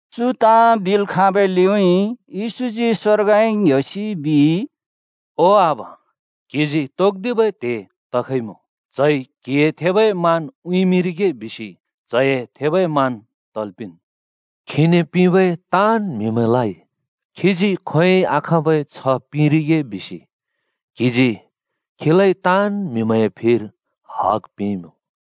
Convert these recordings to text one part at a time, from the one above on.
चु ताँ बिल् खाँबै लिउँइँ येशूजी स्वर्गउँइँ ङ्‍ह्‍योसि बिइ, “ओ आबा, क्जिजी तोक्दिबै त्हे तखइमुँ। च्हइ क्हिए थेबै मान उँइँमिंरिगे बिसि च्हए थेबै मान तल् पिंन्। खीने पिंबै ताँन् म्हिमैंलाइ खीजी खोंयोंइ आखाँबै छ्ह पिंरिगे बिसि क्‍हिजी खीलाइ ताँन् म्हिमैंए फिर हग पिंइँमुँ।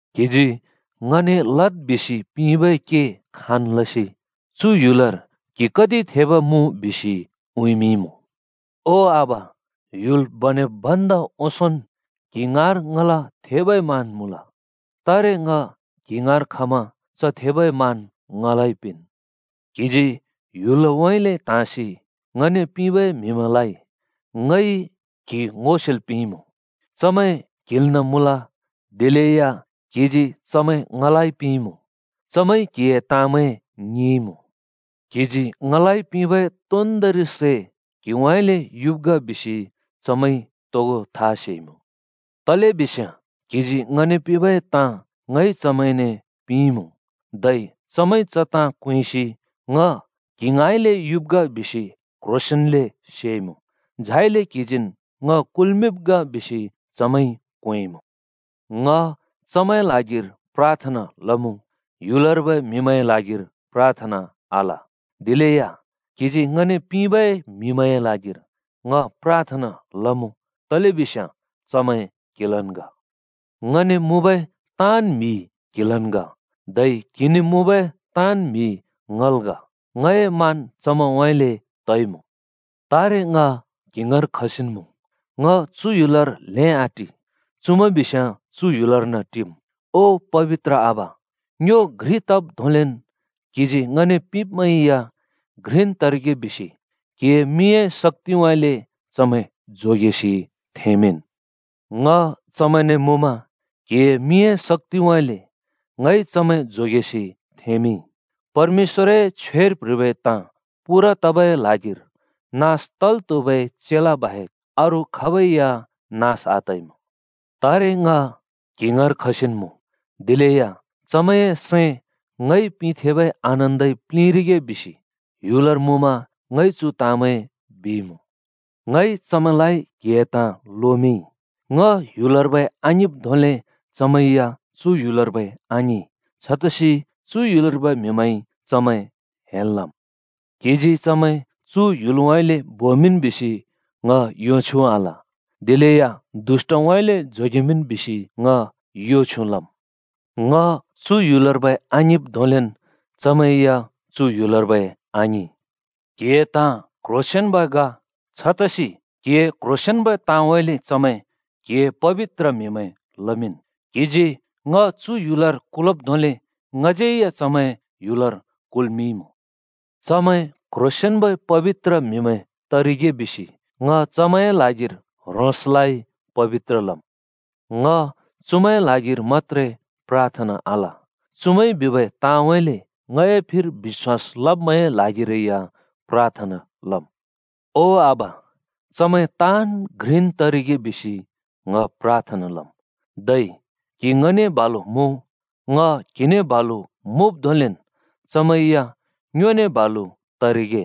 क्हिजी ङने लद् बिसि पिंबै के खाँन् लसि चु ह्‍युलर क्हि कति थेब मुँ बिसि उँइँमिंइमुँ। ओ आबा, ह्‍युल बनेब् भन्दा ओंसोंन् क्हि ङाँर ङला थेबै मान मुँल। तारे ङ क्हि ङाँर खमा च थेबै मान ङलाइ पिंन्। “क्हिजी ह्‍युलउँइँले त्हाँसि ङने पिंबै म्हिमैंलाइ ङइ क्हि ङो सेल् पिंइँमुँ। चमैं क्हिल्ना मुँल दिलेया क्हिजी चमैं ङलाइ पिंइँमुँ। चमैंइ क्हिए ताँमैं ङिंइँमुँ। क्हिजी ङलाइ पिंबै तोन्दोंरि सै क्हिउँइँले युब् ग बिसि चमैंइ तोगो था सेइमुँ। तलेबिस्याँ क्हिजी ङने पिंबै ताँ ङइ चमैंने पिंइँमुँ। धै चमैंइ च ताँ क्वेंसि ङ क्हि ङाँइले युब् ग बिसि क्ह्रोंसेंन्ले सेइमुँ। झाइले क्हिजीन् ङ कुल्मिंब् ग बिसि चमैंइ क्वेंइँमुँ। “ङ चमैंए ल्हागिर प्राथना लमुँ। ह्‍युलर्बै म्हिमैंए ल्हागिर प्राथना आल, दिलेया क्हिजी ङने पिंबै म्हिमैंए ल्हागिर ङ प्राथना लमुँ, तलेबिस्याँ चमैं क्हिलन् ग। ङने मुँबै ताँन् म्हि क्‍हि‍लन् ग, धै क्हिने मुँबै ताँन् म्हि ङल् ग। ङए मान चमैंउँइँले तइमुँ। तारे ङ क्हि ङाँर खसिन् मुँ। ङ चु ह्‍युलर ल्हें आटि, चुमैं बिस्याँ चु ह्‍युलर्न टिम्। ओ पबित्र आबा, ङ्यो घ्रि तब् धोंलेन् क्हिजी ङने पिंब्मैं या घ्रिन् तरिगे बिसि क्हिए मिंए शक्‍तिउँइँले चमैं जोगेसि थेंमिंन्। ङ चमैंने मुँमा क्हिए मिंए शक्‍तिउँइँले ङइ चमैं जोगेसि थेंमिंइ। परमेश्‍वरए छ्वेर प्ह्रिबै ताँ पूरा तबै ल्हागिर नास तल् त्हुबै चेला बाहेक अरू खाबै या नास आतइमुँ। “तारे ङ क्हि ङाँर खसिन्‌ मुँ, दिलेया चमैंए सैं ङइ पिंथेंबै आनन्दइ प्लिंरिगे बिसि ह्‍युलर मुँमा ङइ चु ताँमैं बिइमुँ। ङइ चमैंलाइ क्‍हिए ताँ लोमिंइ। ङ ह्‍युलर्बै आङिंब् धोंले चमैं या चु ह्‍युलर्बै आङिं। छतसि चु ह्‍युलर्बै म्हिमैंइ चमैं हेल् लम्। क्हिजी चमैं चु ह्‍युलउँइँले बोमिंन् बिसि ङ यो छ्युँ आल। दिलेया दुष्‍टउँइँले जोगेमिंन् बिसि ङ यो छ्युँ लम्। ङ चु ह्‍युलर्बै आङिंब् धोंलेन् चमैं या चु ह्‍युलर्बै आङिं। क्हिए ताँ क्ह्रोंसेंन्ब ग। छतसि क्हिए क्ह्रोंसेंन्बै ताँउँइँले चमैं क्हिए पबित्र म्हिमैं लमिंन्। क्हिजी ङ चु ह्‍युलर कुलब् धोंले ङज्यै या चमैं ह्‍युलर कुल्मिंइमुँ। चमैं क्ह्रोंसेंन्बै पबित्र म्हिमैं तरिगे बिसि ङ चमैंए ल्हागिर ह्रोंसलाइ पबित्र लम्। “ङ चुमैंए ल्हागिर मत्‍त्रे प्राथना आल, चुमैंइ बिबै ताँउँइँले ङए फिर बिश्‍वास लब्मैंए ल्हागिरै या प्राथना लम्। ओ आबा, चमैं ताँन् घ्रिन् तरिगे बिसि ङ प्राथना लम्। धै क्हि ङने बालु मुँ, ङ क्हिने बालु मुँब् धोंलेन् चमैं या ङ्योने बालु तरिगे।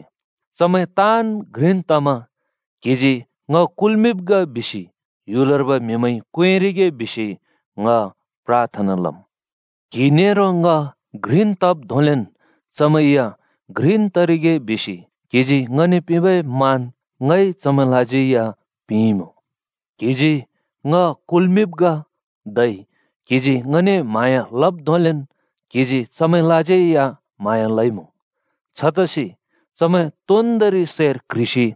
चमैं ताँन् घ्रिन् तमा क्हिजी ङ कुल्मिंब् ग बिसि ह्‍युलर्बै म्हिमैंइ क्वेंरिगे बिसि ङ प्राथना लम्। क्हि नेरो ङ घ्रिन् तब् धोंलेन् चमैं या घ्रिन् तरिगे बिसि क्हिजी ङने पिंबै मान ङइ चमैंलाज्यै या पिंइँमुँ। क्हिजी ङ कुल्मिंब् ग धै क्हिजी ङने म्हाँया लब् धोंलेन् क्हिजी चमैंलाज्यै या म्हाँया लइमुँ। छतसि चमैं तोन्दोंरि सैर क्ह्रिसि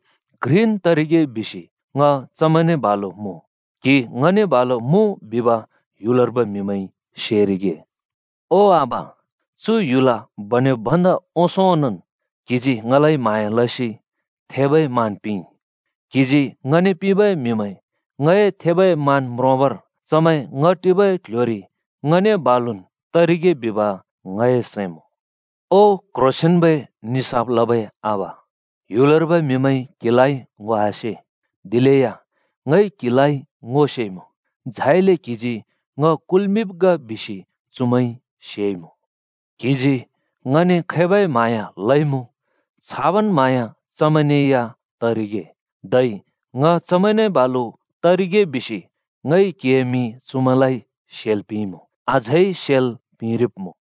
घ्रिन् तरिगे बिसि ङ चमैंने बालु मुँ, क्हि ङने बालु मुँ बिब ह्‍युलर्बै म्हिमैंइ सेरिगे। “ओ आबा, चु ह्‍युल बनेब् भन्दा ओंसों ओंनोंन् क्हिजी ङलाइ म्हाँया लसि थेबै मान पिंइ। क्हिजी ङने पिंबै म्हिमैं ङए थेबै मान म्रोंबर चमैं ङ टिबै क्ल्ह्‍योरि ङने बालुन् तरिगे बिब ङए सैं मुँ। ओ क्ह्रोंसेंन्बै निसाफ लबै आबा, ह्‍युलर्बै म्हिमैंइ क्‍हिलाइ ङो आसे। दिलेया ङइ क्‍हिलाइ ङो सेइमुँ। झाइले क्‍हिजी ङ कुल्‍मिंब् ग बिसि चुमैंइ सेइमुँ। क्हिजी ङने खैबै म्हाँया लइमुँ, छाबन् म्हाँया चमैंने या तरिगे, धै ङ चमैंने बालु तरिगे बिसि ङइ क्हिए मिं चुमैंलाइ सेल् पिंइमुँ, अझै सेल् पिंरिब्मुँ।”